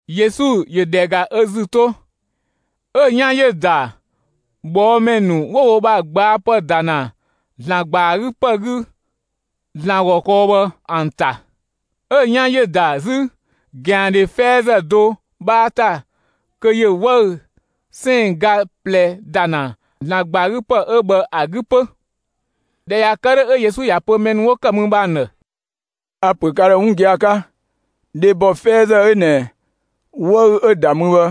Yesu ‑yö ‑dhɛ ‑ga ö ‑zü 'to, 'ö‑ 'yan ‑yö ‑da ꞊bhɔɔmɛ ‑nu 'wo wo ‑bha ꞊gbaapë ‑da ‑na ‑Zlan ‑gba ‑a 'gü ‑pë 'gü, ‑Zlan ‑gɔ kɔɔ bhë ‑an ‑ta. 'Ö‑ 'yan ‑yö ‑da 'zü ꞊gɛandhe 'fɛɛzë do 'bhaa ‑ta kö ‑yö 'wëü‑ 'sɛɛn‑ ga ꞊plɛ ‑da ‑na ‑Zlan ‑gba ‑a 'gü ‑pë 'ö bhë ‑a 'gü 'pö. ꞊Dhɛ ꞊ya kë 'dhö, 'ö Yesu ‑ya pö mɛ ‑nu 'wo ‑kë mü bhë ‑an ‑dhë: «A‑ ‑pö ka ‑dhë 'wun gia‑ 'ka: Dhebɔ 'fɛɛzë 'ö ꞊nɛ 'wëü‑ 'ö‑ ‑da mü bhë,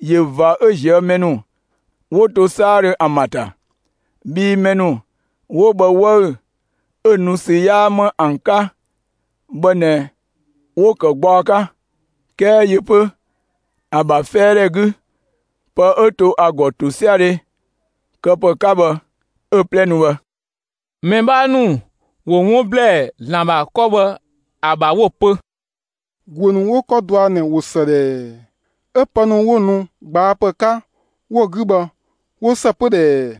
꞊yö ꞊va 'ö ꞊zië' mɛ ‑nu 'wo to 'saadhö ‑an ‑bha ‑ta. Bhii mɛ ‑nu 'wo bhë 'wëü‑ 'ö‑ nu ‑sü 'yaa 'më ‑an 'ka bhë ꞊nɛ 'wo‑ ‑kë gbaɔ 'ka; 'kɛɛ yö 'pö, ‑a ‑bha 'fɛɛdhɛ 'gü pë 'ö to ‑a ‑gɔ ‑tosiadhe këpë 'ka bhë 'ö‑ 'plɛ ‑nu bhë.» Mɛ 'bhaa ‑nu ‑wo 'wun ‑blɛɛ ‑Zlan ‑bha 'kɔ bhë ‑a ‑bha 'wo‑ pö: «‑Guö ‑nu 'wo 'kɔ dɔa ꞊nɛ ꞊wo ‑së ꞊dhɛɛ! 'Ö pë ‑nu 'wo‑ nu ꞊gbaapë 'ka 'wo‑ 'gü bhë, ‑wo ‑së 'pö ꞊dhɛɛ!»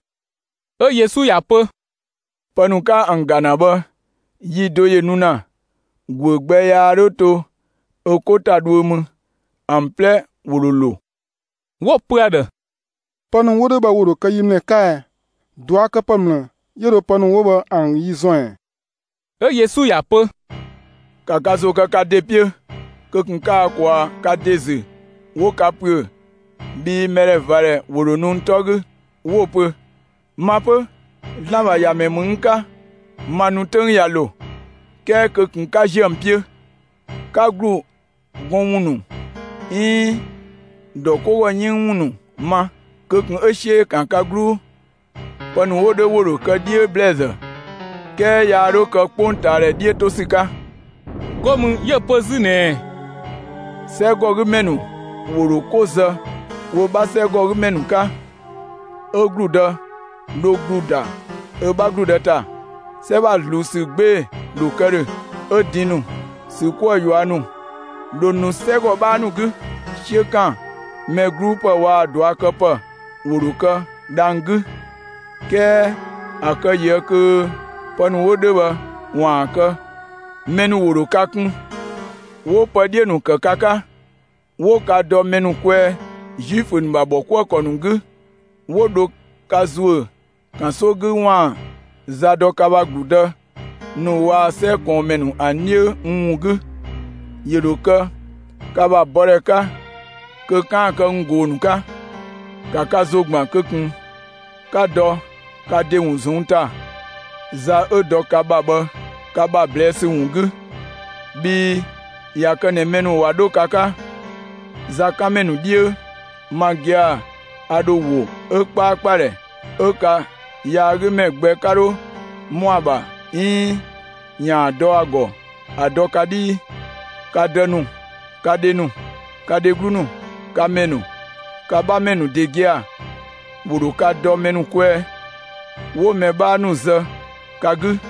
'Ö Yesu ‑ya pö: «Pë ‑nu 'ka ‑an ‑ga ‑na bhë, yi do ‑yö nu ‑na, ‑guö gbɛ yaa 'dho to ö 'ko ‑ta dhuö mü, ‑an 'plɛ ‑wo ‑dho ‑lo.» 'Wo‑ pö ‑a ‑dhë: «Pë ‑nu 'wo 'dhö bhë ‑wo ‑dho kë yi ‑mlë 'ka ɛ? ꞊Duakëpë ‑mlë 'yö dho pë ‑nu 'wo bhë ‑an yi ‑zɔn ‑ɛ?» 'Ö Yesu ‑ya pö: «‑Ka ka ‑zo kë ka ‑de 'piö! Kö ꞊kun 'ka ka ꞊kwaa' ka ‑de ‑zü 'wo ka ‑püö! Bhii mɛdhɛvadhɛ ‑wo ‑dho nu n 'tɔ 'gü, 'wo‑ pö: ‹Ma 'pö, ‑Zlan ‑bha ‑Yamɛ ‑mü n 'ka! Ma nu 'töng ꞊ya ‑lo!›, 'kɛɛ kö ꞊kun 'ka ‑ziö ‑an 'piö! 'Ka ‑glu gɔn ‑wun ‑nu 'iin ‑dɔ 'ko ‑gɔ 'yënng ‑wun ‑nu ma, kö ꞊kun 'ö 'siö ‑yö ‑kan ka 'gluu! Pë ‑nu 'wo 'dhö ‑wo ‑dho kë 'dhiö ‑blɛɛzë, 'kɛɛ yaa 'dho kë 'kpongtaadhɛ 'dhiö 'to ‑sü 'ka.» 'Go mü 'yö‑ pö 'zü ꞊nɛɛ: «'Sɛgɔgümɛ ‑nu ‑wo ‑dho 'ko zë wo 'bha 'sɛgɔgümɛ ‑nu 'ka, ö ‑gludë dho ‑glu ‑da ö 'bha ‑gludë ‑ta; 'sɛ ‑bha ꞊zluun ‑sü 'gbee‑ ‑dho kë ‑dhö, 'ö din ‑nu, ‑sü 'kuë‑ ꞊yua' ‑nu dho nu 'sɛgɔ 'bhaa ‑nu 'gü, 'siö ‑kan mɛ 'gluu ‑pë waa‑ ꞊duakëpë ‑wo ‑dho kë dhang‑ 'gü. 'Kɛɛ ‑a kë ꞊yië' kö pë ‑nu 'wo 'dhö bhë ‑waan kë, mɛ ‑nu ‑wo ‑dho ka kun, 'wo pë 'dhiö‑ ‑nu kë ka 'ka, 'wo ka dɔ mɛ ‑nu kwɛɛ Zuifö ‑nu ‑bha ‑bhɔkuëkɔ ‑nu 'gü, 'wo dho ka ‑zuö ‑kanso 'gü ‑waan za dɔ ka ‑bha ‑gludë ‑nu waa‑ 'sɛ ꞊kɔɔnmɛ ‑nu ‑an 'dhiö n ‑wun 'gü. ‑Yö ‑dho kë ka ‑bha bɔdhɛ 'ka kö 'kaan‑ kë n ꞊goo‑ ‑nu 'ka. ‑Ka ka ‑zo ‑gban kö ꞊kun 'ka dɔ ka ‑de ‑wun ꞊zɔnng' ‑ta za 'ö dɔ ka ‑bha bhë, ka ‑bha ꞊blɛɛ' ‑sü ‑wun 'gü, bhii ꞊ya kë ꞊nɛ mɛ ‑nu ꞊wa 'dho ka 'ka zakanmɛ ‑nu 'dhiö, ma gia‑, a ‑dho ‑wo 'ö 'kpaakpadhɛ 'ö ka yaagümɛ gbɛ 'ka 'dho ‑mɔ ‑a ‑bha 'iin ‑yaan dɔ ‑a ‑gɔ ‑a dɔ ka 'dhii. Ka dë ‑nu, ka dhe ‑nu, ka dheglu ‑nu, ka mɛ ‑nu, ka 'bhamɛ ‑nu ‑de gia‑, ‑wo ‑dho ka dɔ mɛ ‑nu kwɛɛ, 'wo mɛ 'bhaa ‑nu zë ka 'gü.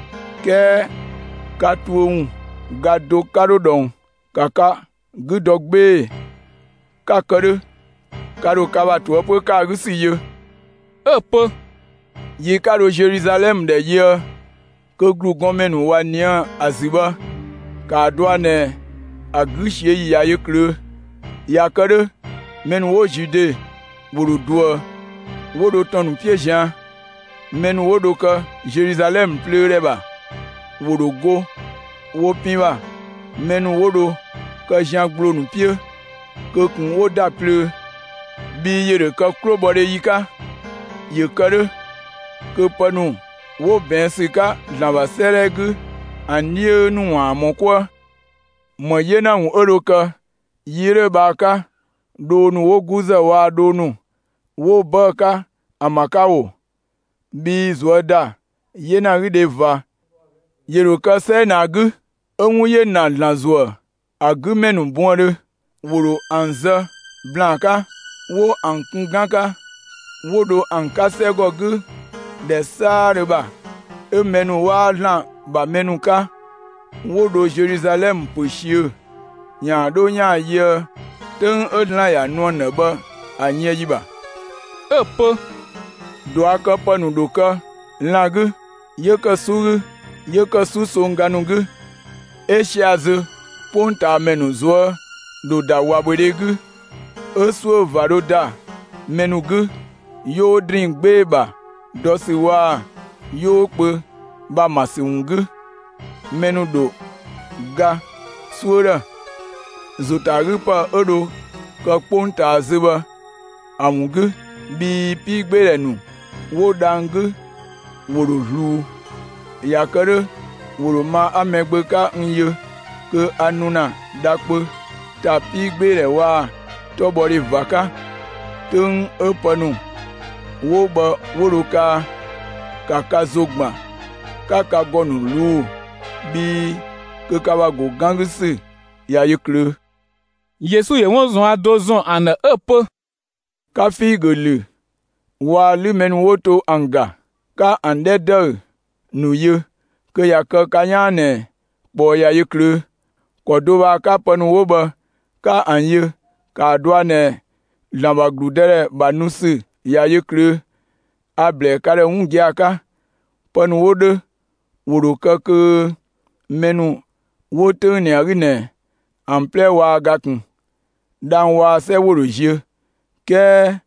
'kɛɛ ka tuö ‑wun ga do 'ka 'dho ꞊dhɔng. ‑Ka ka 'gü dɔ 'gbee‑, 'ka‑ kë 'dhö, 'ka dho ka ‑bha ꞊toëpö ‑kë ‑a 'gü ‑sü yö.» 'Ö‑ pö: «Yi 'ka dho Zeluzalɛmë ‑dhɛ yöë kö ‑glugɔnmɛ ‑nu ꞊wa ꞊nië' ‑a ‑zü bhë, ‑kaa dɔa ꞊nɛ ‑a 'gü ꞊siö'‑ ‑yi ꞊ya yö ꞊klöö'. ꞊Ya kë 'dhö mɛ ‑nu 'wo Zude ‑wo ‑dho ꞊duë, ‑wo 'dho ‑tɔn ‑nu 'piö ꞊zian'; mɛ ‑nu 'wo dho kë Zeluzalɛmë plöödhɛ ‑bha, ‑wo ‑dho go wo pin ‑bha; mɛ ‑nu 'wo dho kë zian ‑gbloo ‑nu 'piö, kö ꞊kun 'wo ‑da plöö, bhii ‑yö ‑dho kë 'klobhɔdhe ‑yi 'ka. ‑Yö kë 'dhö, kö pë ‑nu 'wo ꞊bɛɛn' ‑sü 'ka ‑Zlan ‑bha 'sëëdhɛ 'gü ‑an 'dhiö ‑nu ‑waan ‑mɔ 'kuë. ‑Më 'yena ‑wun 'ö dho kë yi 'ö 'dhö bhë ‑a 'ka, dhoo ‑nu 'wo 'guzë waa‑ dhoo ‑nu 'wo 'bëë‑ 'ka ‑an ‑bha 'ka ‑oo! Bhii ꞊zuö' ‑da 'yenagüdhe ꞊va ‑yö ‑dho kë 'sɛ 'ö ꞊nɛ ‑a 'gü, 'ö 'wun ‑yö na ‑Zlan ‑zuë ‑a 'gü ‑mɛ ‑nu buëndhö. ‑Wo ‑dho ‑an zë ‑blaan 'ka, 'wo ‑an kun 'gan 'ka, 'wo dho ‑an 'ka 'sɛgɔ 'gü ‑dhɛ 'saadhö ‑bha, 'ö mɛ ‑nu 'waa ‑Zlan ‑bha mɛ ‑nu 'ka 'wo dho Zeluzalɛmë ‑pö ꞊siö' ‑yaan 'dho ‑yaan yöë 'töng 'ö ‑Zlan ‑ya nu ‑an ‑dhë bhë ‑a yën ‑yi ‑bha.» 'Ö‑ pö: «꞊Duakëpë ‑nu ‑dho kë lan‑ 'gü, 'yö ‑kë 'su 'gü, 'yö ‑kë 'susongga ‑nu 'gü; 'ö sia‑ zö, 'kpongtaamɛ ‑nu ꞊zuö' dho ‑da ꞊wabhödhe 'gü, 'ö 'suö ꞊va dho ‑da mɛ ‑nu 'gü, 'yoo ‑drinng 'gbee‑ ‑bha dɔ ‑sü waa‑ 'yoo kpö ‑bha ‑ma ‑sü ‑wun 'gü. Mɛ ‑nu ‑dho ga 'suö ‑dhë, ‑zo ‑ta ‑a 'gü ‑pë 'ö dho kë 'kpongtaa zö bhë ‑a ‑wun 'gü, bhii 'piigbeedhɛ ‑nu 'wo dhang‑ 'gü ‑wo ‑dho ꞊zluun. ꞊Ya kë 'dhö ‑wo ‑dho ma 'a Mɛgbö 'ka n yö kö a nu ‑na dha kpö ‑ta 'piigbeedhɛ waa‑ 'tɔbhɔdhe ꞊va 'ka. 'Töng 'ö pë ‑nu 'wo bhë 'wo dho kaa, ‑ka ka ‑zo ‑gban 'ka ka ‑gɔ ‑nu ꞊luu'‑, bhii kö ka ‑bha ‑go 'gan 'gü ‑sü ꞊ya yö ꞊klöö'.» Yesu ‑yö 'wun ꞊zuan' do ‑zɔn ‑an ‑dhë 'ö‑ pö: «‑Ka figö ‑lü waa‑ 'lü mɛ ‑nu 'wo to ‑an ‑ga! 'Ka ‑an 'dhɛ ‑dëü ‑nu yö, kö ꞊ya kë ka 'yaan ꞊nɛ ꞊kpɔɔ ꞊ya yö ꞊klöö'. ‑Kɔ do bhë ‑a 'ka pë ‑nu 'wo bhë 'ka ‑an yö, ‑kaa dɔa ꞊nɛ ‑Zlan ‑bha ‑gludëdhɛ ‑bha nu ‑sü ꞊ya yö ꞊klöö'. A‑ ‑blɛɛ ka ‑dhë 'wun gia‑ 'ka: Pë ‑nu 'wo 'dhö ‑wo ‑dho kë kö mɛ ‑nu 'wo 'töng ꞊nɛ ‑a 'gü ꞊nɛ ‑an 'plɛ waa ga ꞊kun. Dhang‑ waa‑ 'sɛ ‑wo ‑dho ziö, 'kɛɛ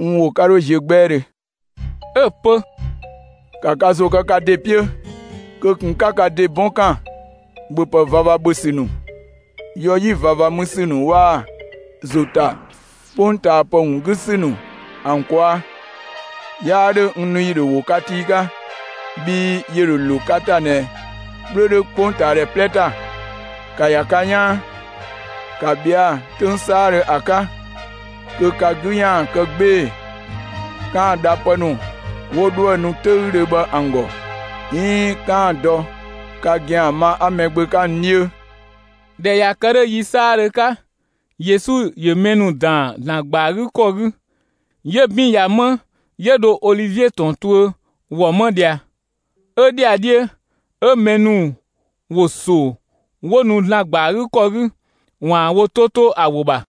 n ‑wo 'ka 'dho ziö 'gbɛɛdhö.» 'Ö‑ pö: «‑Ka ka ‑zo kë ka ‑de 'piö! Kö ꞊kun 'ö 'ka ka ‑de 'bɔn ‑kan ‑bhöpë ꞊vava ‑bhö ‑sü ‑nu, yɔ 'yi ꞊vava mü ‑sü ‑nu waa‑ ‑zo ‑ta 'kpongtaapë ‑wun 'gü ‑sü ‑an ꞊kwaa', 'yaa 'dhö n nu ‑yi ‑dho ‑wo ka tii 'ka. Bhii ‑yö ‑dho ‑lo ka ‑ta ꞊nɛ 'kplö 'dhö 'kpongtaamɛ 'plɛ ‑ta. ‑Ka ‑ya ka 'yaan, ‑ka ꞊bhɛa'‑ 'töng 'saadhö ‑a 'ka, kö ka 'gü ‑yaan kë 'gbee‑ 'kaan‑ dha pë ‑nu 'wo 'dhoë‑ nu 'töüdhö bhë ‑an ‑gɔ, 'iin 'kaan‑ dɔ ka ‑gɛan ma 'a Mɛgbö 'ka n 'dhiö.» ꞊Dhɛ ꞊ya kë 'dhö yi 'saadhö 'ka, Yesu ‑yö mɛ ‑nu ‑daan ‑Zlan ‑gba ‑a 'gü ‑kɔ 'gü; 'yö 'bin ꞊ya 'më, 'yö dho Olivie ‑tɔn tuö ‑wɔ 'ma ꞊dhia. 'Ö ‑dhiadhiö 'ö mɛ ‑nu ‑wo ‑so 'wo nu ‑Zlan ‑gba ‑a 'gü ‑kɔ 'gü ‑waan wo 'to 'to ‑a ‑wo ‑bha.